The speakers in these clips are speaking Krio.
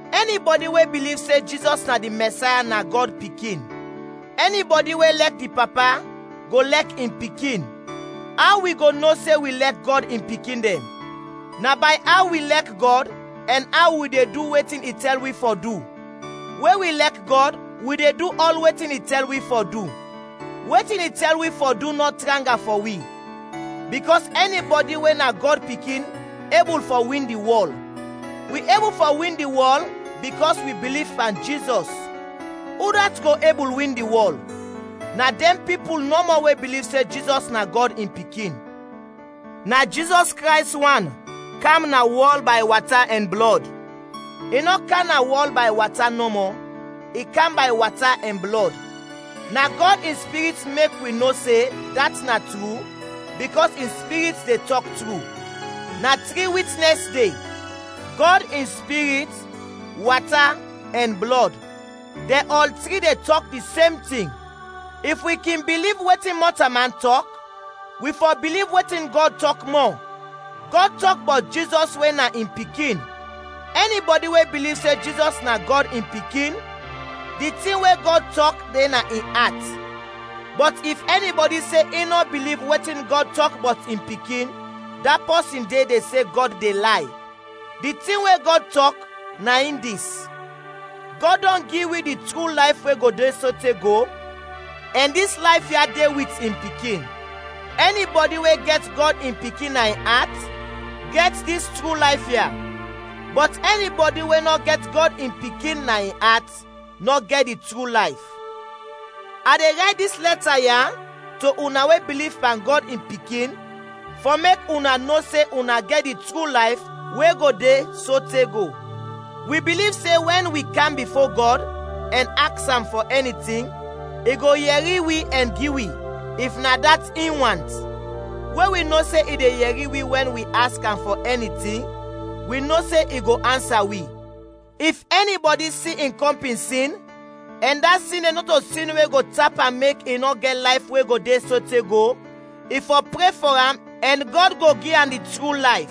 Ɛni bɔdi we biliv se Jizɔs na di Mɛsaya na Gɔd pikin. Ɛni bɔdi we lɛk di Papa, go lɛk in Pikin. Aw wi go no se wi lɛk Gɔd in pikin dɛn, na bay aw wi lɛk Gɔd ɛn aw wi de du wetin i tɛl wi fɔ du. We wi lɛk Gɔd wi de du ɔl wetin i tɛl wi fɔ du. Wetin i tɛl wi fɔ du nɔ tranga fɔ wi, bikɔs ɛni bɔdi we na Gɔd pikin ebul fɔ win di wɔl. Wi ebul fɔ win di wɔl bikɔs wi biliv pan Jizɔs. Udat go ebul win di wɔl? Na dɛn pipul nɔmɔ we biliv se Jizɔs na Gɔd in Pikin. Jizɔs Krays wan kam na wɔl bay wata ɛn blɔd. I nɔ kam na wɔl bay wata nɔmɔ, i kam bay wata ɛn blɔd. Na Gɔd in Spirit mek wi no se dat na tru bikɔs in Spirit de tɔk tru. Na tri witnɛs de: Gɔd in Spirit, wata ɛn blɔd; dɛn ɔl tri de tɔk di sem tin. If wi kin biliv wetin mɔtalman tɔk, wi fɔ biliv wetin Gɔd tɔk mɔ; Gɔd tɔk bɔt Jizɔs we na in Pikin. Ɛni bɔdi we biliv se Jizɔs na Gɔd in Pikin, di tin we Gɔd tɔk de na in at, bɔt if ɛni bɔdi se in nɔ biliv wetin Gɔd tɔk bɔt in Pikin, da pɔsin de de se Gɔd de lay. Di tin we Gɔd tɔk, na in dis: Gɔd dɔn gi wi di tru layf we go de sote go, ɛn dis layf ya de wit in Pikin. Ɛni bɔdi we gɛt Gɔd in Pikin na in at, gɛt dis tru layf ya; bɔt ɛni bɔdi we nɔ gɛt Gɔd in Pikin na in at, nɔ gɛt di tru layf. A de rayt dis lɛta ya to una we biliv pan Gɔd in Pikin fɔ mek una no se una gɛt di tru layf we go de sote go. Wi biliv se wɛn wi kam bifo Gɔd ɛn aks am fɔ ɛni tin, i go yɛri wi ɛn gi wi, if na dat in want. We wi no se i de yɛri wi wɛn wi aks am fɔ ɛni tin, wi no se i go ansa wi. If ɛni bɔdi si in kɔmpin sin ɛn da sin de nɔto sin we go tap am mek i nɔ gɛt layf we go de sote go, i fɔ pre fɔ am ɛn Gɔd go gi am di tru layf.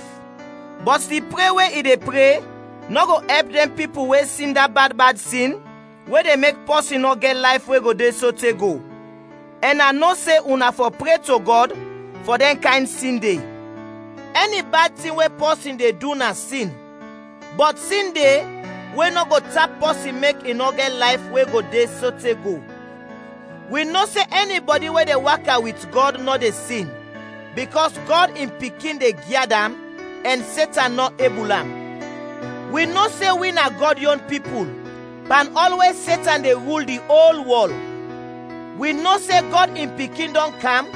Bɔt di pre we i de pre nɔ go ɛp dɛn pipul we sin da bad bad sin we de mek pɔsin nɔ gɛt layf we go de sote go, ɛn a nɔ se una fɔ pre to Gɔd fɔ dɛn kayn sin de. Ɛni bad tin we pɔsin de du na sin, bɔt sin de we nɔ go tap pɔsin mek i nɔ gɛt layf we go de sote go. Wi no se ɛni bɔdi we de waka wit Gɔd nɔ de sin, bikɔs Gɔd in Pikin de gyad am ɛn Setan nɔ ebul am. Wi no se wi na Gɔd yon pipul, pan ɔl we Setan de rul di ol wɔl. Wi no se Gɔd in Pikin dɔn kam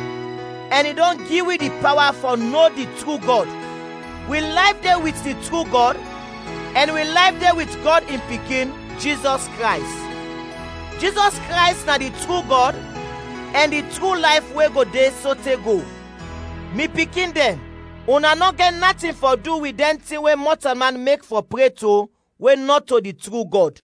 ɛn i dɔn gi wi di pawa fɔ no di tru Gɔd. Wi layf de wit di tru Gɔd ɛn wi layf de wit Gɔd in Pikin, Jizɔs Krays. Jizɔs Krays na di tru Gɔd ɛn di tru layf we go de sote go. Mi pikin dɛn, una nɔ gɛt natin fɔ du wit dɛn tin we mɔtalman mek fɔ pre to we nɔto di tru Gɔd.